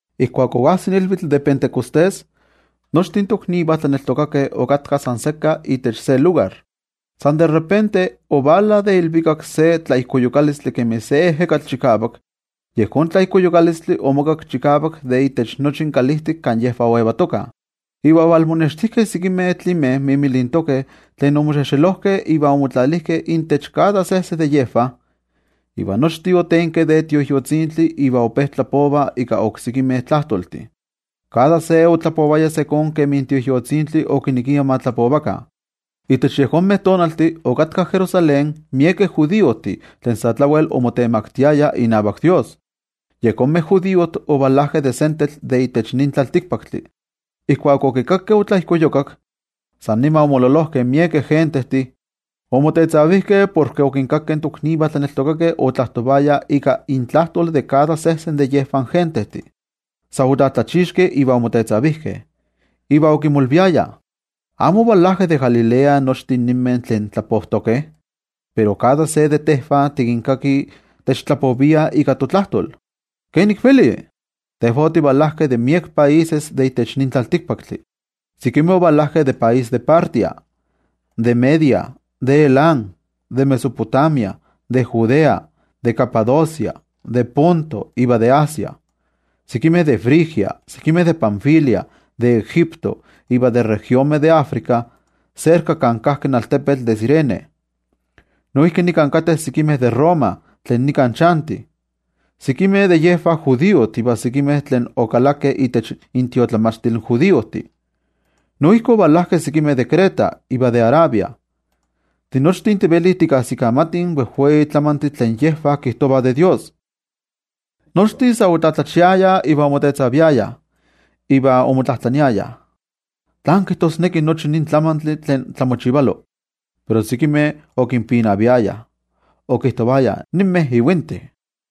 Ijkuak oajsik ilvitl de Pentecostés, nochtin toknivah tlaneltokakeh okatkah san sekka itech se lugar. San de repente, ovala de ilvikak se tlaijkoyukalistli kemi se ejekatl chikavak. Yejón tlaijkoyukalistli omokakki chikavak itech nochi kalijtik kan yejvah okatkah. Iva ovalmonextijkeh sekimeh tlimeh mimilintokeh tlen omoxexelojkeh iva omotlalijkeh intech kada sejse de yejvah. Iva nochtin otenkeh de Tioijyotzintli iva ope tlapovah ika oksekimeh tlajtoltih. Kada se otlapovaya ijkó kemi in Tioijyotzintli okinekia ma tlapova. Itech yejonmeh tonaltih okatkah Jerusalén miekeh judiojtih tlen sa tlawel omotemaktiayah inavak Dios. Yejonmeh judiojtih ovalajkeh de sentetl de itech nin tlaltikpaktli. Ijkuak okikakkeh otlaijkoyukak, san nima omololojkeh miekeh gentejtih. Omotetzavijkeh porke okinkakeh toknivah tlaneltokakeh otlajtovayah ika intlajtol de kada sejsen de yejonmeh gentejtih. Sa otlatlachixkeh iva omotetzavijkeh, iva okimolviayah: —¿Amo ovalajkeh de Galilea nochtin ninmeh tlen tlapojtokeh? Pero kada se de tejvah tikinkakih techtlapoviah ika totlajtol, ¿kenik velih? Tejvah otivalajkeh de miek países de itech nin tlaltikpaktli. Sekimeh ovalajkeh de país de Partia, de Media, de Elam, de Mesopotamia, de Judea, de Capadocia, de Ponto iva de Asia, sekimeh de Frigia, de Panfilia, de Egipto iva de regionmeh de Africa serka kan kajki in altepetl de Cirene. Noijki nika kateh sekimeh de Roma tlen nika chantih. Sekimeh de yejvah judiojtih iva sekimeh tlen okalakeh itech intiotlamachtil in judiojtih. Noijki ovalajkeh sekimeh de Creta iva de Arabia. Tinochtin tivelih tikajsikamatih in wejwei tlamantih tlen yejvah kijtovah de Dios. Nochtin sa otlatlachiayah iva omotetzaviayah, iva omotlajtlaniayah: —¿Tlán kijtosneki nochi nin tlamantli tlen tlamochivalo? Pero sekimeh okinpinaviayah, okijtovayah: —¡Ninmeh ivintih!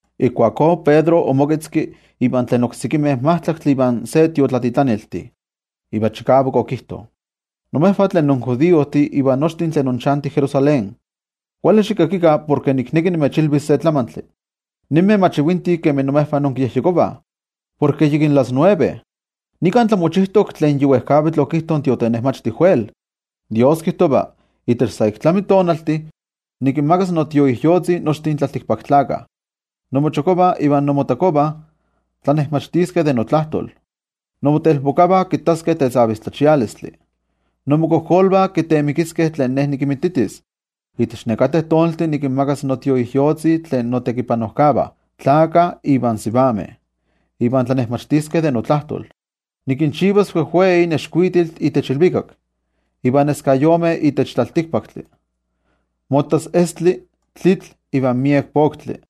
Ijkuakó Pedro omoketzki ivan tlen oksekimeh majtlaktli ivan se tiotlatitlaniltih, iva chikavak okijto: —Imejvah tlen injudiojtih iva nochtin tlen inchantih Jerusalén, kuali xikakikah porke nikneki nimechilvis se tlamantli. Ninmeh mach ivintih kemi imejvah inkiyejyekovah, porke yikin las nueve. Nika tlamochijtok tlen yi wejkavitl okijto in tiotenejmachti Joel: ToYejwatzi kijtova: Itech sa ik tlami tonaltih, nikinmakas noTioijyotzi nochtin tlaltikpaktlakah. Inmochokojvah iva inmotakojvah tiotlanejmachtiskeh de notlajtol. Inmotelpokavah kittaskeh tetzavistlachialistih, inmokojkolvah kiteemikiskeh tlen Ne nikinmititis. Itech nekateh tonaltih nikinmakas noTioijyotzi tlen notekipanojkavah, tlakah ivan sivameh, iva tiotlanejmachtiskeh de notlajtol. Nikinchivas wejwei nexkuitiltih itech ilvikak, iva neskayomeh itech tlaltikpaktli: mottas estli, tlitl iva miek poktli.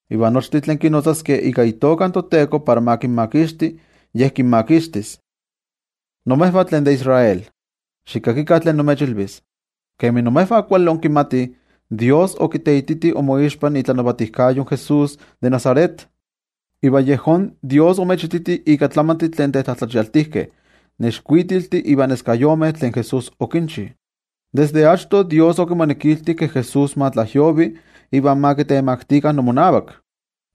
Iva nochtin tlen kinotzaskeh ika itoka in toTeko para ma kinmakixti, Ye kinmakixtis. ’Imejvah tlen de Israel, xikakikah tlen nimechilvis: Kemi imejvah kuali inkimatih, toYejwatzi okiteititi inmoixpa itlanavatijkayo in Jesús de Nazaret, iva yejón toYejwatzi omechititi ika tlamantih tlen tetlatlachialtijkeh, nexkuitiltih iva neskayomeh, tlen Jesús okinchi. Desde achto, toYejwatzi okimonekilti ke Jesús ma tlajyovi iva ma kitemaktikah inmomak.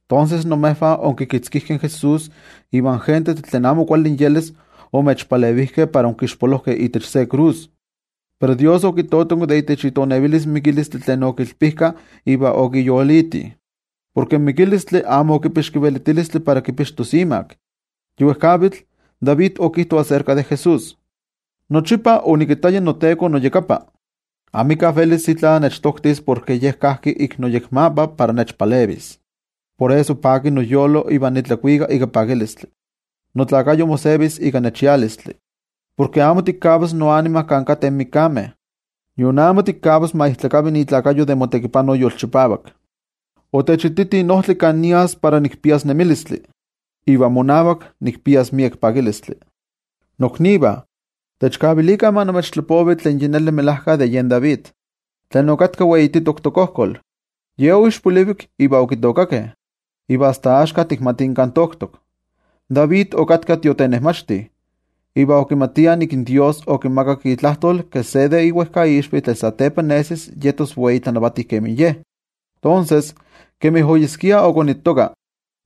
Tonses, imejvah onkikitzkijkeh in Jesús iva in gentejtih tlen amo kuali inyelis omechpalevijkeh para onkixpolojkeh itech se krus. Pero toYejwatzi okitotonki de itech itonevilis mikilistli tlen okilpijkah iva okiyoliti. Porke in mikilistli amo okipixki velitilistli para kipixtos imak. Yi wejkavitl David okijto aserka de Jesús: Nochipa onikittaya in noTeko noyakapa. Amika velis itla nechtoktis porke Ye kajki ik noyekmapa para nechpalevis. Por eso paki noyolo iva nitlakuika ika pakilistli. Nokuerpo mosevis ika nechialistli. Porke amo tikavas noanima kan kateh mikameh, nion amo tikavas ma ijtlakavi ikuerpo de motekipano yolchipavak. Otechititi in ojtli kan nias para nikpias nemilistli, iva monavak nikpias miek pakilistli. ’Noknivah, techkavilikah ma nimechtlapovi tlen yi neli melajka de yen David, tlen okatka weititok tokojkol, ye oixpolivik iva okitookakeh, iva asta axka tikmatih kan toktok. David okatka tiotenejmachti, iva okimatia nik in toYejwatzi okimakak itlajtol ke se de iwejkaixvi tlen satepa nesis yetos wei tlanavati kemi ye. Tonses, kemi oyeskia okonittoka,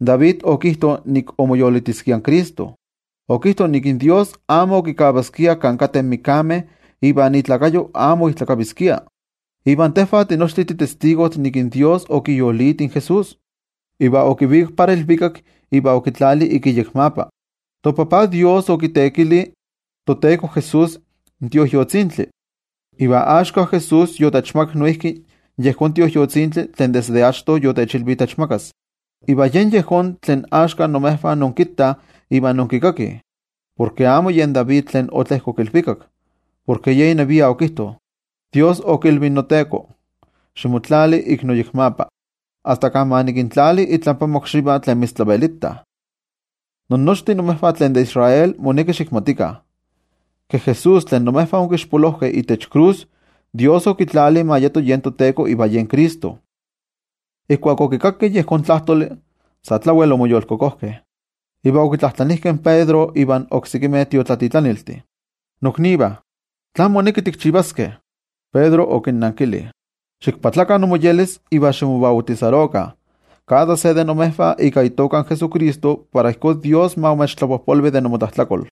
David okijto nik omoyolitiskia in Cristo. Okijto nik in toYejwatzi amo okikavaskia kan kateh mikameh iva ikuerpo amo oijtlakaviskia. Iva tejvah tinochtin titestigojtih nik toYejwatzi okiyoliti in Jesús, iva okivikak para ilvikak iva okitlali ik iyekmapa. ToTajtzin Dios okiteekili toTeko Jesús in Tioijyotzintli. Iva axka Jesús yotechmakak noijki yejón Tioijyotzintli tlen desde achto yotechilvi techmakas. Iva yen yejón tlen axka imejvah inkittah iva inkikakih. Porke amo yen David tlen otlejkok ilvikak, porke ye inevia okijto: In toYejwatzi okilvi in noTeko: “Ximotlali ik noyekmapa, asta kan ma nikintlali itlampa mokxivah tlen mitztlavelitah.” ’Innochtin imejvah tlen de Israel moneki xikmatikah, ke Jesús tlen imejvah onkixpolojkeh itech krus, toYejwatzi okitlali ma yeto yen toTeko iva yen Cristo. Ijkuak okikakkeh yejón tlajtoli, sa tlawel omoyolkokojkeh, iva okitlajtlanijkeh in Pedro ivan oksekimeh tiotlatitlaniltih: —Noknivah, ¿tlán moneki tikchivaskeh? Pedro okinnankili: —Ximoyolkopakah, iva ximobautisarokah kada se de imejvah ika itoka in Jesucristo para ijkó toYejwatzi ma imechtlapojpolvi de inmotlajtlakol.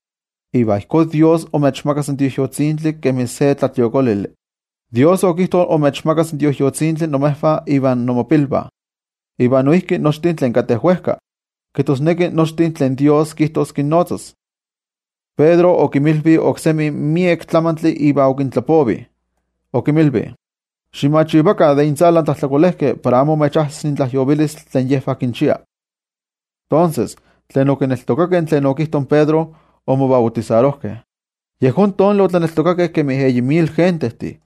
Iva ijkó Ye imechmakas in Tioijyotzintli kemi se tlatliokolili. In toYejwatzi okijto imechmakas in Tioijyotzintli imejvah iva inmopilvah, iva noijki nochtin tlen kateh wejka, kijtosneki nochtin tlen toYejwatzi kijtos kinnotzas. Pedro okinmilvi okseki miek tlamantli iva okinnajnavati, okinmilvi: —Ximachivakah de intzalan tlajtlakolejkeh para amo imechajsis in tlajyovilistli tlen yejvah kinchia. Tonses, tlen okineltokakeh tlen okijto in Pedro, omobautisarojkeh. Yejón tonali otlaneltokakeh kemi eyi mil gentejtih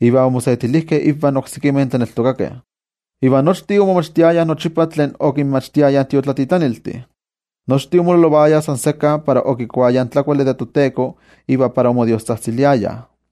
iva omosetilijkeh ivan oksekimeh tlaneltokakeh. Iva nochtin okimochikaviliayah momachtiskeh tlen okinmachtiayah in tiotlatitlaniltih, omololovayah san sekka, okikuayah in tlakuali de toTeko iva omodiostzajtziliayah.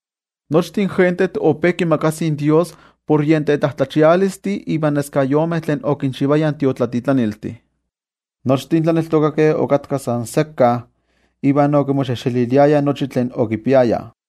Nochtin gentejtih ope kimakasih in Dios por yen tetlatlachialistih ivan neskayomeh tlen okinchivayah in tiotlatitlaniltih. Nochtin tlaneltokakeh okatkah san sekka iva okimoxejxeliliayah nochi tlen okipiayah.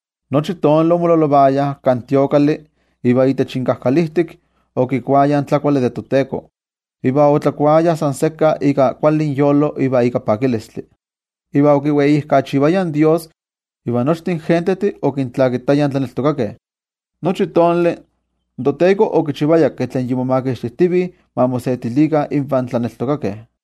Nochi tonali omololovayah kan templo, iva itech inkajkalijtik okikuayah in tlakuali de toTeko, iva otlakuayah san sekka ika kuali inyolo iva ika pakilistli, iva okiweijkachivayah in Dios, iva nochtin gentejtih okintlakitayah in tlaneltokakeh. Nochi tonali in toTeko okichivaya ke tlen momakixtijtivih ma mosetilikah invan tlaneltokakeh.